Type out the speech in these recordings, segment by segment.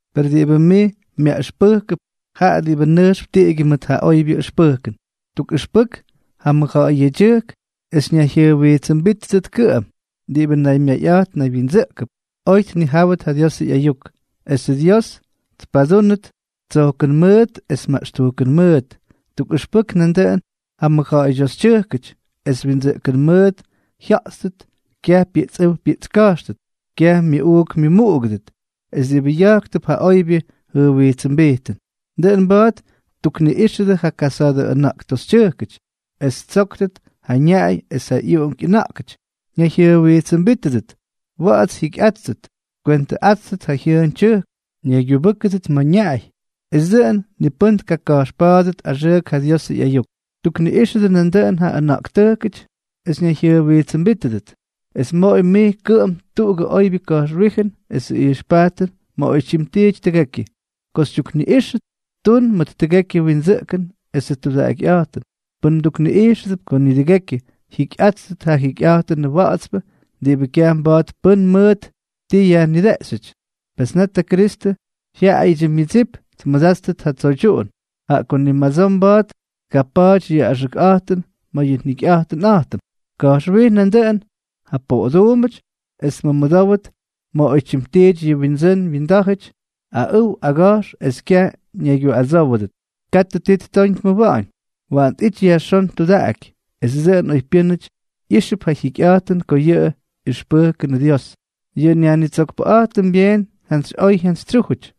Per diꞌibʉ mij myaꞌʉxpʉ́kʉp, jaꞌa diꞌibʉ nʉjxp tiꞌigyʉ mʉt ja oybyʉ ʉxpʉjkʉn. Tukꞌʉxpʉk ja mʉjja̱ꞌa̱y yedyʉjk es ñayjyʉjwijtsʉmbítʉdʉt kʉꞌʉm, diꞌibʉ naymyayꞌa̱jt naywyindsʉꞌkʉp, oy tnijáwʉt ja Diosʉ ꞌyayuk, esʉ Dios tpadúnʉt tsojkʉn mʉʉt es maꞌxtujkʉn mʉʉt. Tukꞌʉxpʉk nandʉꞌʉn ja mʉjja̱ꞌa̱ydyoxytyʉjkʉty es windsʉꞌkʉn mʉʉt jyaꞌayꞌátʉt, kyaj pyiꞌtsꞌʉ́w pyiꞌtska̱jxʉt, kyaj myʉꞌuuk myʉmuꞌugʉdʉt, es diꞌibʉ ya̱jktʉp ja oybyʉ jʉjwijtsʉmbijtʉn. Dʉꞌʉn mba̱a̱t ttukniꞌíxʉdʉ ja kasa̱a̱dʉ ʉna̱ꞌktoxytyʉjkʉty es ttsóktʉt ja ñaꞌay es ja ꞌyuꞌunk ꞌyʉna̱ꞌkʉty, ñayjyʉjwijtsʉmbítʉdʉt, wa̱ꞌa̱ts jyikyꞌáttʉt, tkwentʉꞌáttʉt ja jyʉʉn tyʉjk, ñaygyubʉ́kʉdʉt ma̱ ñaꞌay, esʉ dʉꞌʉn ni pʉ́n tkaka̱jxpa̱a̱dʉt axʉʉk ja Diosʉ ꞌyayuk. Tukniꞌíxʉdʉ nandʉꞌʉn ja ʉna̱ꞌktʉjkʉty es ñayjyʉjwijtsʉmbítʉdʉt. Es moꞌoy mij kʉꞌʉm tuꞌugʉ oybyʉ ka̱jxwíjʉn esʉ ijxpajtʉn ma̱ oytyim tiity tʉgekyʉ. Ko xytyukniꞌíxʉt, tun mʉt tʉgekyʉ windsʉꞌkʉn esʉ tudaꞌakyꞌa̱jtʉn. Pʉn mdukniꞌijxʉp ko nidʉgekyʉ tjikyꞌáttʉt ja jyikyꞌa̱jtʉnʉ wa̱ꞌa̱tspʉ diꞌibʉ kyaj mba̱a̱t pʉ́n mʉt ti yajnideꞌxyʉty, pes net ja Kristʉ jyaꞌayʉdyʉ myʉdsip tmʉdáttʉt ja tsoydyuꞌun, jaꞌa ko ni madsoo mba̱a̱t tkapa̱a̱ty yʉ axʉkꞌa̱jtʉn ma̱ yʉ njikyꞌa̱jtʉnꞌa̱jtʉm. Ka̱jxwij nandʉꞌʉn ja poꞌoduumbʉty es tmʉmʉdówdʉt ma̱ oytyim tiity yʉ wyindsʉ́n wyindá̱jʉty, aꞌʉw aga̱jx es kyaj ñaygyuꞌadsówʉdʉt. Katʉ ti ttoñ tmʉwa̱ꞌa̱ñ. Waꞌan tꞌity yajxón tudaꞌaky, es dʉꞌʉn oypyʉ́nʉty ijxʉp ja jyikyꞌa̱jtʉn ko ja ꞌyʉxpʉjkʉnʉ Dios, yʉ nYajnitsokpʉꞌa̱jtʉm, byeen jyantsyꞌoy jyantsytsyújʉty.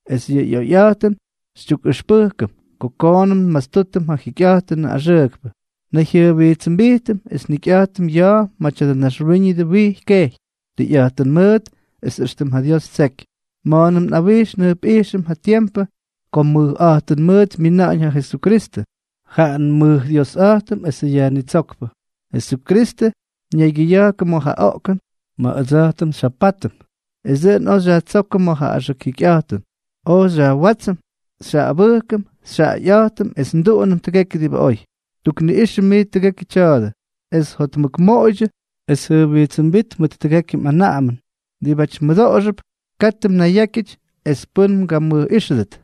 Es yʉ oyꞌa̱jtʉn xytyukꞌʉxpʉjkʉm ko koonʉm nmastútʉm ja jikyꞌa̱jtʉnʉ axʉʉkpʉ, nnayjyʉjwijtsʉmbijtʉm es njikyꞌa̱jtʉm ya̱a̱ ma̱ tya̱dʉ naxwíñʉdʉ wijy kejy, tʉyꞌa̱jtʉn mʉʉt es éxtʉm ja Dios ttseky, ma̱a̱nʉm nꞌawijx njʉjpꞌijxʉm ja tiempʉ ko mʉjꞌa̱jtʉn mʉʉt myina̱ꞌa̱ñ ja Jesukristʉ, jaꞌa nmʉjDiosꞌa̱jtʉm esʉ Yajnitsókpʉ. Jesukristʉ ñaygyʉya̱jkʉ ma̱ ja oꞌkʉn ma̱ ʉdsa̱jtʉm xyjapátʉm, es dʉꞌʉn oj xyajtsókʉm ma̱ ja axʉk jikyꞌa̱jtʉn, oj xyajwátsʉm, xyjaꞌaꞌꞌabʉjkʉm, xyjaꞌayꞌa̱jtʉm es nduꞌunʉm tʉgekyʉ diꞌibʉ oy. Tukniꞌꞌixʉ mij tʉgekyʉ tya̱a̱dʉ, es jotmʉkmoꞌoydyʉ es jʉjwijtsʉmbít mʉt tʉgekyʉ mꞌanaꞌamʉn diꞌibáty mmʉdoꞌoxʉp. Katʉ mnayyákyʉty es pʉ́n mgamʉjꞌíxʉdʉt.